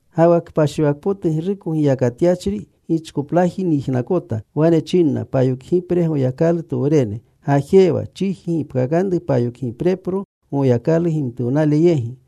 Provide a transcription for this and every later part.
Ga wa kpashiwakpotugruko giyakatyachri gichkoplaji nyijnakota. Wane chinna payokgipre Goyakalutowrene, “Gajewa. Chiji gipkakanru payokgiprepro Goyakalu gimtuwnale yegi.”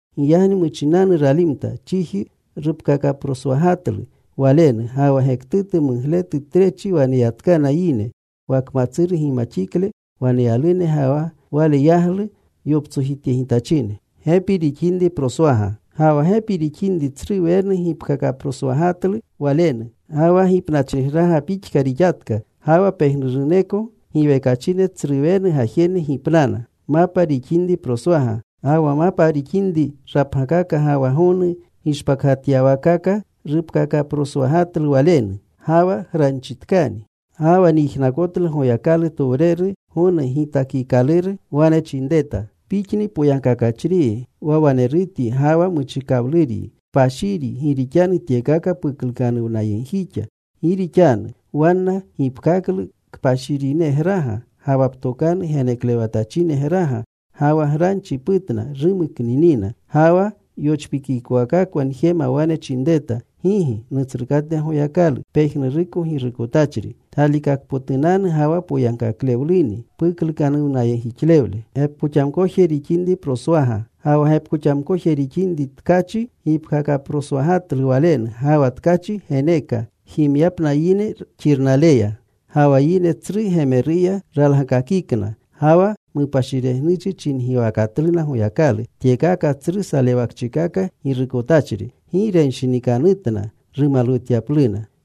Giyagni muchinanu ralimta. Chiji rupkakaproswagatlu walenu. Ga wa gektutu mugletu trechi waneyatkana yine, wa kmatsuru gimaxikle waneyalune ga wa wale yaglu yoptsojityegitachine. Ga wa gepi rixininri tsru wenu gipkakaproswagatlu walenu. Ga wa gipnachrigraga pixka rixatka. Ga wa pejnuruneko giwekachine tsruwenu gajene gipnana. Ga wa mapa rixinri rapgakaka ga wa gonu gishpakgatyawaakaka rupkakaproswagatlu walenu. Ga wa granchitkani. Ga wa nyijnakotlu Goyakalutowreru gonu gitakikaluru wane chinreta: Pixni poyagkakachriyi, wa wanerutyi ga wa muchikawluryi, kpashiryi, gi rixanu tyekaka puklukanuwnayegjixa. Gi rixanu wanna gipkaklu kpashirinegraga, ga wa ptokanu geneklewatachinegraga, ga wa granchi putna. Rumuknunina. Ga wa yochpikikowakakwa njema wane chinreta: Gigi, Nutsrukate Goyakalu, Pejnuruko Girukotachri. Galikakpotunanu ga wa poyankaklewluni puklukanuwnayegjixlewle. Ga wa gepkoxamkoje rixinri tkachi gipkakaproswagatlu walenu. Ga wa tkachi geneeka jimyapna yine xirnaleya. Ga wa yine tsru gemeruya ralgakakikna. Ga wa mupashiregnuchi chingiwakatluna Goyakalu, tyekaka tsru salewakchikaka girukotachri. Gi renshinikautna rumalwutyapluna.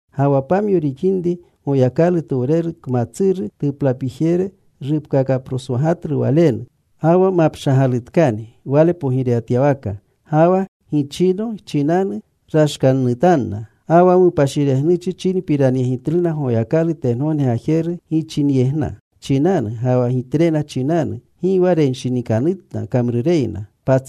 Ga wa pamyo rixinri Goyakalutowreru kmatsuru tuplapijere rupkakaproswagatlu walenu. Ga wa mapshagalutkani wale pogirewatyawaka. Ga wa gichino chinanu rashkannutanna. Ga wa mupashiregnuchi chinpiranyegitluna Goyakalu tengogne Gajeru gichinyegna chinanu ga wa gitrena chinanu. Gi wa renshinikanutna kamrureyna.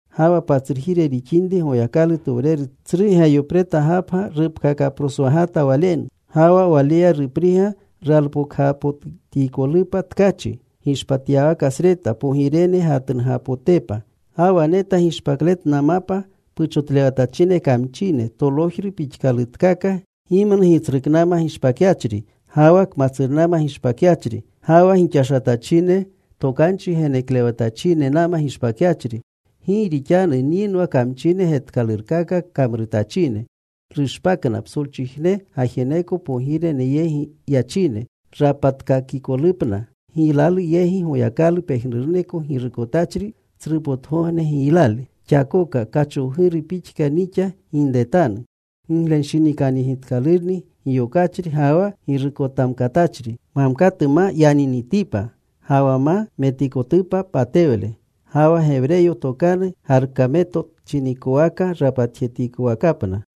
Ga wa patsrujire rixinri Goyakalutowreru tsru Geyopreta Gapga rupkakaproswagata walenu. Ga wa walega gipriga ralpokgapotikolupa tkachi gishpatyawakasreta pogirene gatnugapotepa. Ga wa neta gishpakletna mapa puchotlewatachine kamchine tolojru pixkalutkaka, gimnu gitsruknama gishpakyachri, ga wa kmatsurnama gishpakyachri, ga wa gixashatachine tokanchi geneklewatachinenama gishpakyachri. Gi rixanu nyinwa kamchine getkalurkaka kamrutachine. Rushpakna, psolchijne gajeneko pogirene yegi yachine, rapatkakikolupna giylalu yegi, Goyakalu pejnuruko Girukotachri tsrupotgogne giylale. “Xakoka kachowguru pixka nixa ginretanu. Giglenshinikanyegitkalurni giyokachri ga wa girukotamkatachri, mamkatu ma yaninitipa. Ga wa ma metikotupa patewle.” Ga wa Gewreyo tokanu Garmaketo chinikowaka rapatkakikowakapna.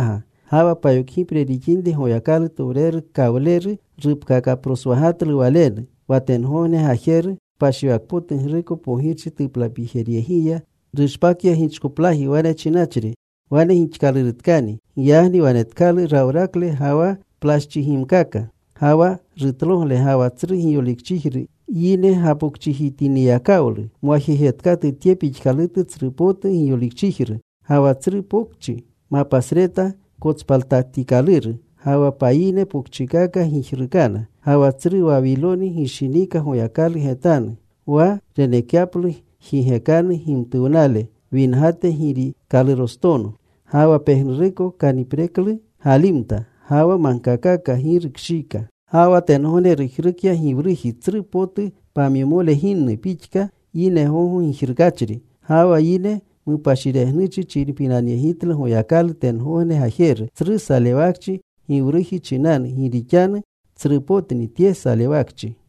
Ga wa payokgipre rixinri Goyakalutowreru kawleru rupkakaproswagatlu walenu. Wa tengogne gajeru kpashiwakpotugruko pogirchi tuplapijeryegiya rushpakya gichkoplaji, wane chinachri, “Wane gixkalurutkani.” Giyagni wanetkalu rawrakle ga wa plaschigimkaka ga wa rutlogle, ga wa tsru giyolikchijru. Yine gapokchijitiniyakawlu mwajejetkatu tye pixkalutu tsrupotu giyolikchijru. Ga wa tsru pokchi mapasreta kotspaltatikaluru. Ga wa payine pokchikaka gijrukana. Ga wa tsru Wawiloni gishiniika Goyakalu getanu, wa renekyaplu jigekanu gimtuwnale wingate girikalurostono. Ga wa pejnuruko kanipreklu galimta. Ga wa magkakaka gi rukshiika. Ga wa tengogne rujrukya giwruji tsru potu pamyomole ginnu pixka, yine gogo gijrukachri. Ga wa yine mupashiregnuchi chinpiranyegitlu Goyakalu tengogne Gajeru, tsru salewakchi giwruji chinanu. Gi rixanu tsrupotni tye salewakchi.